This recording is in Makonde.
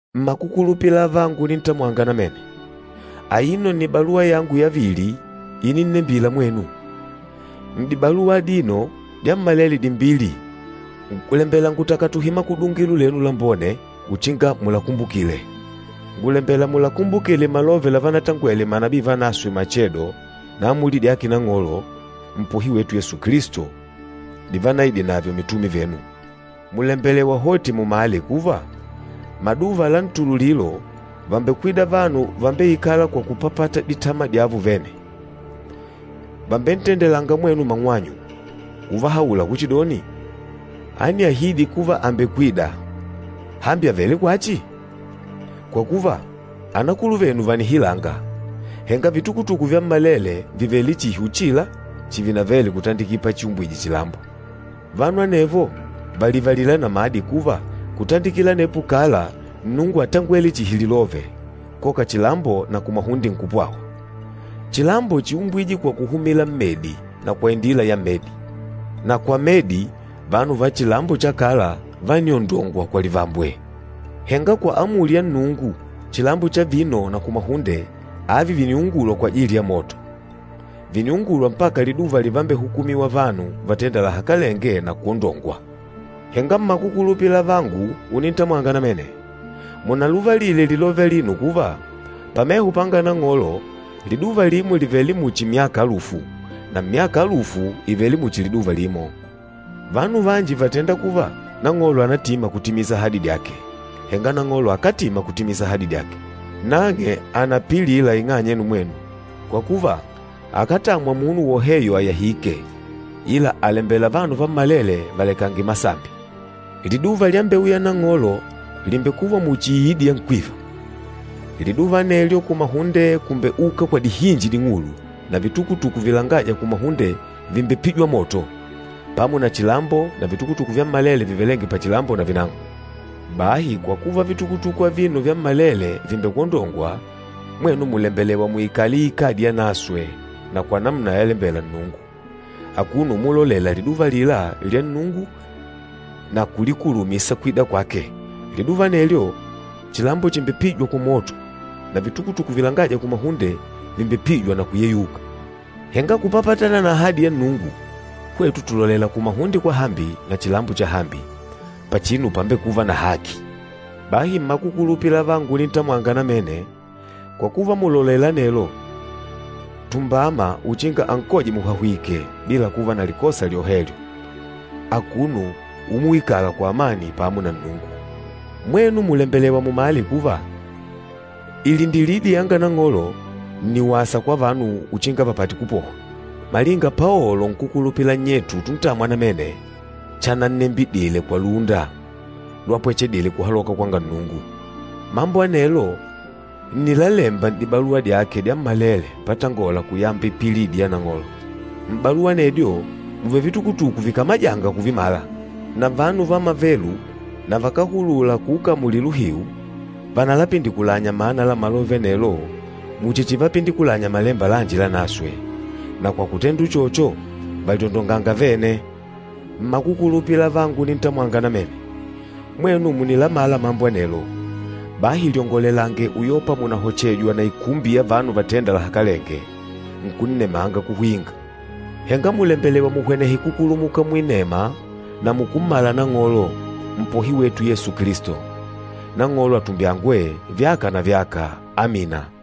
Mmakukulupila avangu unintamwanga namene, aino nni baluwa yangu yavili ininnembila mwenu. N'dibaluwa adino dyammalele dimbili ngùlembela ngutakatuhe makudungilo lenu lambone uchinga mulakumbukile. Ngùlembela mulakumbukile malove lavanatangwele manabii vanaswe machedo na amuli dyake Nang'olo, Mpohi wetu Yesu Kilisto divanaidinadyo mitume venu. Mùlembelewa hoti mumale kuva, maduva la ntululilo vàmbekwida vanu vambeikâla kwa kupapata ditama dyavo vene. Vàmbentendelanga mwenu mang'wanyu, uvahaula kuchidoni, “Ániahidi kuva àmbekwida! Hambi àvele kwachi? Kwa kuva, anakuluvenu vànihilanga, henga vitukutuku vyammalele vìvele chihi uchila chivinavele kutandikila pachiumbwije chilambo.” Vanu anevo vàlivalila namadi kuva kutandikila anepo kala Nnungu átangwele chihi lilove, koka chilambo na kumahunde nkupwawa. Chilambo chíumbwije kwa kuhumila mmedi na kwa indila ya medi. Na kwa medi, vanu va chilambo cha kala vániondongwa kwa livambwe. Henga kwa amuli ya Nnungu, chilambo cha vino na kumahunde, avi vìniungulwa kwajili ya moto. Vìniungulwa mpaka liduva livambehukumiwa vanu vatênda lahakalenge na kwondongwa. Henga mmakukulupila avangu unintamwanga namene, munalivalile lilove alino kuva, pameho panga Nang'olo liduva limo lìvele muchi myaka alufu, na myaka alufu ìvele muchi liduva limo. Vanu vanji vàtenda kuva Nang'olo ànatima kutimisa ahadi dyake, henga Nang'olo akátima kutimisa ahadi dyake. Nang'e ànapilila ing'anya yenu mwenu, kwa kuva akátamwa munu woheyo àyahike, ila àlembela vanu vammalele valekange masambi. Liduva lyambeuya Nang'olo lìmbekuva muchi iidi ya nkwiva. Liduva anelyo kumahunde kùmbeuka kwa dihinji ding'ulu na vitukutuku vilangâja kumahunde vìmbepijwa moto, pamo na chilambo na vitukutuku vyammalele vivelênge pachilambo navinang'o. Bahi kwa kuva vitukutuku avino vyammalele vìmbekwondongwa, mwenu mùlembelewa muikale iikadi yanaswe na kwa namuna yalembela Nnungu, akuno umulolela liduva alila lya Nnungu na kulikulumisa kwida kwake. Liduva anelyo, chilambo chimbepijwa kwa moto na vitukutuku vilangâja kumahunde vìmbepijwa na kuyeyuka. Henga kupapatana na ahadi ya Nnungu, hwetu tùlolela kumahunde kwahambi na chilambo chahambi, pachinu pámbekùvà na haki. Bahi mmakukulupila avangu unintamwanga namene, kwa kuva mùlolela anelo, tumbama uchinga ankoje muhahwìkè bila kuva na likosa lyohelyo, akuno umuikala kwa amani pamo na Nnungu. Mwenu mùlembelewa mumale kuva ilindilidi yanga Nang'olo nni wasa kwa vanu uchinga vapate kupohwa, malinga Paolo nkúkulupila nnyetu utuntamwa namene chanannembidile kwa lúnda lwapwechedile kuhaloka kwanga Nnungu. Mambo anelo nni lálèmbà n'dibaluwa dyake dyammalele patangola kuyamba ipililidi ya Nang'olo. M'baluwa anedyo mùvele vitukutuku vikamajânga kuvimala. Na vanu va mavelu na vakáhulula kuukamulila uhiu, vànalapindikulanya mana la malove anelo muchi chivapindikulanya Malemba lanji Lanaswe. Na kwa kutenda uchocho vàlyondonganga vene. Mmakukulupila avangu unintamwanga namene, mwenu mùnilamala mambo anelo. Bahi lyongolelange uyopa mùnahochejwa na ikumbi ya vanu vatendânga lahakalenge, nkunnemanga kuhwinga. Henga mùlembelewa muhwenehe kukulumuka muinema na mukummala Nang'olo, Mpohi wetu Yesu Kilisto. Nang'olo atumbyangwe, vyaka na vyaka! Amina.